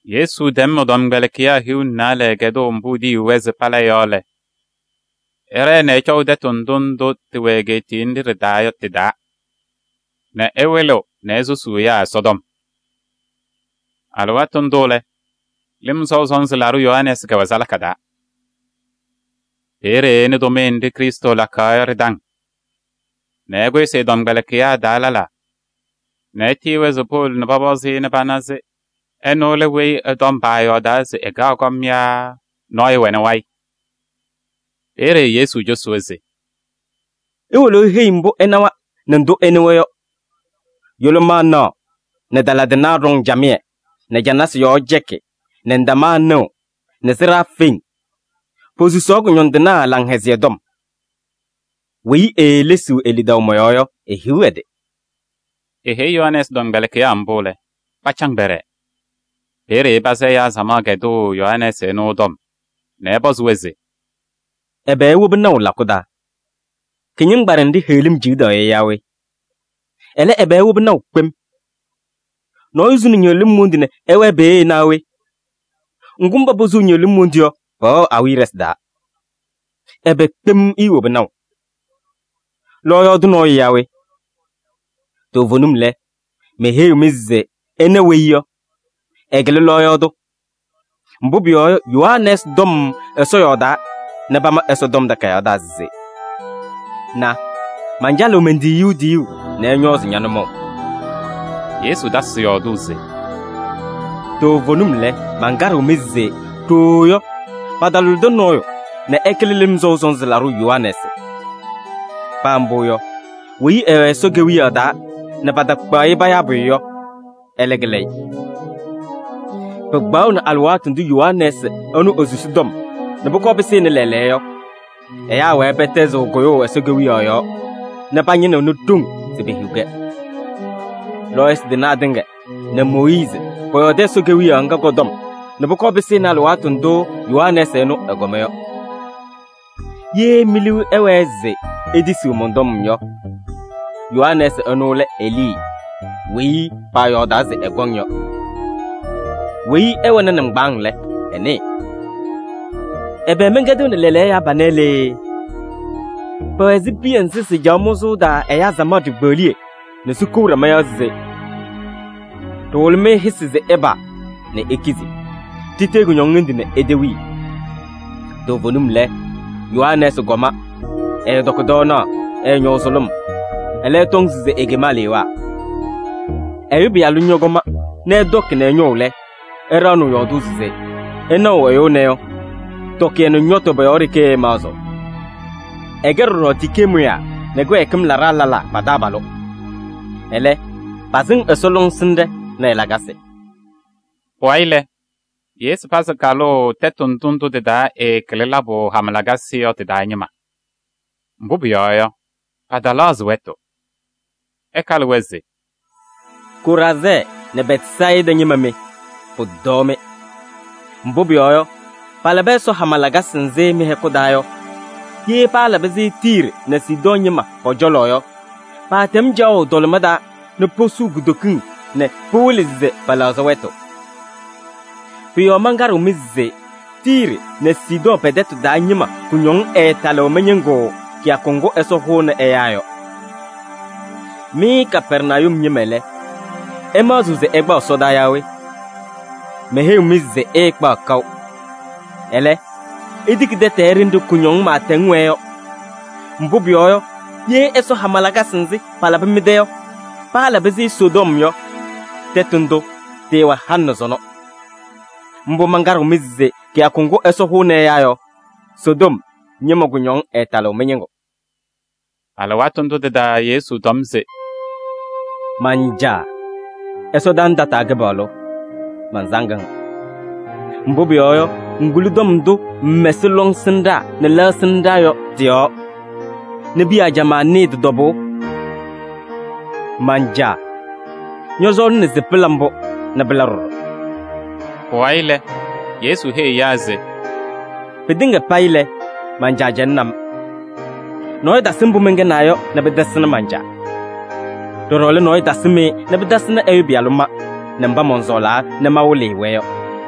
Yesu tɛm ɛ-tɔmkpɛlɩkɩyaa hiu nɛ naalɛ kɛdʋʋ mbʋ etiyiɣ-wɛ se pala yɔ lɛ, ɛɖɛɛ nɛ ɛcɔʋ tɛtʋ ndʋ ndʋ tɩwɛ egeetiye nɖɩ ɖɩ-taa yɔ tɩ-taa nɛ ɛwɩlɩɣ nɛ esusuu ɛyaa Ɛsɔtɔm. Alɩwaatʋ ndʋ lɛ, Lɩm Sɔʋ Sɔnzɩ Laɖʋ Yohanɛɛsɩ kɛwɛ salaka taa. Peeye ɛnɩ tʋmɩyɛ nɖɩ Krɩstʋ lakaɣ yɔ ɖɩ-taŋ nɛ ɛkʋsɩ ɛ-tɔmkpɛlɩkɩyaa taa lɛlaa nɛ etiyi-wɛ se powolo pɔpɔzɩ-ɩ nɛ pana se ɛnʋ lɛ weyi ɛ-tɔm paayɔɔdaa se ɛkaɣ kɔm yɔ yaa nɔɔyʋ wɛnɩ wayɩ? Peeye Yesu cosi-wɛ se: “Iwolo iheyi-i mbʋ ɩnawa nɛ ndʋ ɩnɩwa yɔ: yʋlʋmaa naɣ nɛ tala tɩnaa ɖɔŋ camɩyɛ nɛ canasɩ yɔɔ cɛkɩ nɛ ndamaa nɩɣ nɛ sɩɖaa feŋ, posusaɣ kʋñɔndɩnaa Laŋhɛzɩyɛ Tɔm. Weyi eelesiɣ e-lidaʋ mɔ-yɔɔ yɔ, ehiɣ ɛ-tɩ!” Eheyi Yohanɛɛsɩ tɔmkpɛlɩkɩyaa mbʋ lɛ, pacaŋ pɛɖɛɛ. Peeye ɛpazɩ ɛyaa samaɣ kɛdʋʋ Yohanɛɛsɩ ɛnʋ ɛ-tɔm nɛ ɛpɔzɩ-wɛ se: “Ɛbɛ iwobi naʋ lakʋ taa? Kɩñɩŋgbaɖɛ nɖɩ heɣlim ciɣdaɣ yɔ yaa we? Ɛlɛ, ɛbɛ iwobi naʋ kpem? Nɔɔyʋ suni ñɩɣlɩm wondu nɛ ɛwɛɛ peeye naa wɛ? Ŋgʋ, mba posuu ñɩɣlɩm wondu yɔ, pɛwɛɣ awiya ɖɩsɩ taa. Ɛbɛ kpem iiwobi naʋ? Lɔɔyaɣ tʋ nɔɔyʋ yaa we? Toovenim lɛ, meheyiɣ-mɩ se ɩna weyi yɔ, ɛkɩlɩ lɔɔyaɣ tʋ. Mbʋ pʋyɔɔ yɔ, Yohanɛɛsɩ tɔm Ɛsɔ yɔɔdaa nɛ pama Ɛsɔtɔm Takayaɣ taa se: ‘Na, mancalɩɣ men-tiyiyu tiyuu nɛ ɛñɔɔzɩ ña-nʋmɔʋ.’” Yesu tasɩ yɔɔdʋʋ se: “Toovenim lɛ, mankaɖɩɣ-mɩ se ɖooo yɔ, patalʋlɩdɩ nɔɔyʋ nɛ ɛkɩlɩ Lɩm Sɔʋ Sɔnzɩ Laɖʋ Yohanɛɛsɩ. Paa mbʋ yɔ, weyi ɛwɛ Ɛsɔ Kewiyaɣ taa nɛ patakpaɣ-ɩ payaa pʋyʋ yɔ, ɛlɛ kɩlɩ-ɩ. Pɩkpaɣʋnɩ alɩwaatʋ ndʋ Yohanɛɛsɩ ɛnʋ esusi tɔm nɛ pʋkɔɔ pɩsɩnɩ lɛɛlɛɛyɔ yɔ, ɛyaa wɛɛ pɛtɛzɩɣ kʋyʋʋ Ɛsɔ Kewiyaɣ yɔɔ nɛ pañɩnɩɣnɩ ɖoŋ se pehiɣ-kɛ. Lɔɔyɩsɩ tɩnaa tɩŋa nɛ Mooyiizi pɔyɔɔdɩ Ɛsɔ Kewiyaɣ ŋga kɔ-tɔm nɛ pʋkɔɔ pɩsɩnɩ alɩwaatʋ ndʋ Yohanɛɛsɩ ɛnʋ ɛkɔma yɔ. Ye mi-liu ɛwɛɛ se itisiɣ mɔn-tɔm yɔ, Yohanɛɛsɩ ɛnʋ lɛ Elii weyi paayɔɔdaa se ɛkɔŋ yɔ. Weyi ɛwɛnɩ nɩŋgbaaŋ lɛ, ɛnɩɩ! “Ɛbɛ mɛnkɛdɩɣnɩ lɛɛlɛɛyɔ ɛyaa panɛ lee? Pɛwɛ ɛzɩ piya nzɩ sɩcaɣ mʋzʋʋ taa ɛyaa samaɣ ɖikpeɣliye nɛ sikou ɖama yɔɔ se: ‘Ɖɩhʋlɩ-mɩ hɩsɩ se ɩpaa nɛ ikizi. Ɖitee kʋñɔŋ hendu nɛ itewii.’ Toovenim lɛ, Yohanɛɛsɩ kɔma, ɛɛtɔkɩ tɔɔnaɣ, ɛɛñɔʋ sʋlʋm. Ɛlɛ, ɩtɔŋ se ekem alewaa. Ɛyʋ Pɩyalʋ ñɔkɔma nɛ ɛtɔkɩ nɛ ɛñɔʋ lɛ, ɩɖaɣnɩɣ yɔɔdʋʋ se: ‘Ɩnaɣʋ ɛyʋ ɛnɛ yɔ, tɔkɩyɛ nɛ ñɔtʋ pɔ-yɔɔ ɖeke ɛmaɣzɩɣ. Ɛkɛ ɖɔɖɔ tikee mʋyaa nɛ kɩwɛɛkɩm laɖaa lɛlaa pa-taabalʋ.’ Ɛlɛ, pasɩŋ Ɛsɔ lɔŋsɩnɖɛ nɛ ɛ-lakasɩ.” Pʋwayɩ lɛ, Yesu pazɩ kalʋʋ tɛtʋ ndʋ ndʋ tɩ-taa ɛɛkɩlɩ labʋ hama lakasɩ yɔ tɩ-taa ñɩma. Mbʋ pʋyɔɔ yɔ, pɛtɛlɛɣzɩ wɛtʋ, ɛkalɩ-wɛ se: “Koraazɛɛ nɛ Bɛtsayɩda ñɩma mɩ! Pʋtɔɔ-mɩ! Mbʋ pʋyɔɔ yɔ, palabɩ Ɛsɔ hama lakasɩ nzɩ mɩ-hɛkʋ taa yɔ, ye paalabɩ-sɩ Tiiri nɛ Sidɔɔ ñɩma pɔ-cɔlɔ yɔ, paatɛm caɣʋ tɔlɩma taa nɛ posuu kutokiŋ nɛ pɩwɩlɩ se pɛlɛɣzɩ wɛtʋ. Pʋ-yɔɔ mankaɖɩɣ-mɩ se Tiiri nɛ Sidɔɔ pɛ-tɛtʋ taa ñɩma kʋñɔŋ ɛɛtalɩɣ mɩ-ñɩŋgʋ kɩyakʋ ŋgʋ Ɛsɔ hʋʋnɩ ɛyaa yɔ. Mɩ Kapɛrnayum ñɩma lɛ, ɩmaɣzɩɣ se ɩkpaɣ ɛsɔdaa yaa we? Meheyiɣ-mɩ se ɩɩkpaɣ kaʋ. Ɛlɛ, itiki tɛtɛɛ ɖenɖe kʋñɔŋ pɩɩtɛŋ wɛɛ yɔ. Mbʋ pʋyɔɔ yɔ, ye Ɛsɔ hama lakasɩ nzɩ palabɩ mɩ-tɛ yɔ, paalabɩ-sɩ Sodom yɔ, tɛtʋ ndʋ tɩɩwɛ halɩ nɛ sɔnɔ. Mbʋ mankaɖɩɣ-mɩ se kɩyakʋ ŋgʋ Ɛsɔ hʋʋnɩ ɛyaa yɔ, Sodom ñɩma kʋñɔŋ ɛɛtalɩɣ mɩ-ñɩŋgʋ.” Alɩwaatʋ ndʋ tɩ-taa Yesu tɔm se: “Man-Caa! Ɛsɔdaa nɛ tataa Kɩpaɣlʋ! Mansaŋ-ŋ. Mbʋ pʋyɔɔ yɔ, ŋkuli tɔm ndʋ ŋmɛsɩ lɔŋsɩnɖaa nɛ lɛɣsɩnɖaa yɔ tɩ-yɔɔ nɛ piya ajamaa nɩɩ tɩ-tɔbʋʋ. Man-Caa! Ñɔsɔɔlɩna se pɩla mbʋ nɛ pɩla ɖɔɖɔ.” Pʋwayɩ lɛ, Yesu heyi ɛyaa se: “Pɩtɩŋa payɩ lɛ, man-Caa cɛlɩnɩ-m. Nɔɔyʋ tasɩ mbʋ mɛnkɛnaa yɔ nɛ pɩtasɩnɩ man-Caa. Ɖɔɖɔ lɛ, nɔɔyʋ tasɩm-ɩ nɛ pɩtasɩnɩ ɛ-Pɩyalʋ ma nɛ mba mɔnsɔɔlaa nɛ mawɩlɩ-ɩ-wɛ yɔ.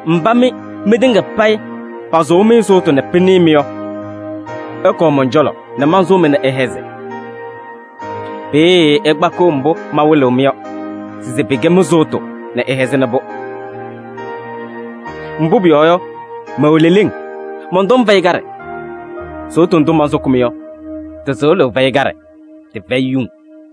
“Mba mɩ mɩtɩŋa payɩ pasʋʋ-mɩ sʋʋtʋ nɛ pɩnɩɩ-mɩ yɔ, ɩkɔɔ mɔn-cɔlɔ nɛ mansʋʋ-mɩ nɛ ɩhɛzɩ. Peeye ɩkpakɩɣ mbʋ mawɩlɩɣ-mɩ yɔ se pɩkɛ mɩ-sʋʋtʋ nɛ ɩhɛzɩnɩ-pʋ. Mbʋ pʋyɔɔ yɔ, mɛwɛ leleŋ, mɔn-tɔm fɛyɩ kaɖɛ. Sʋʋtʋ ndʋ mansʋkɩ-mɩ yɔ, tɩ-sɩɣlʋʋ fɛyɩ kaɖɛ, tɩfɛyɩ yuŋ.”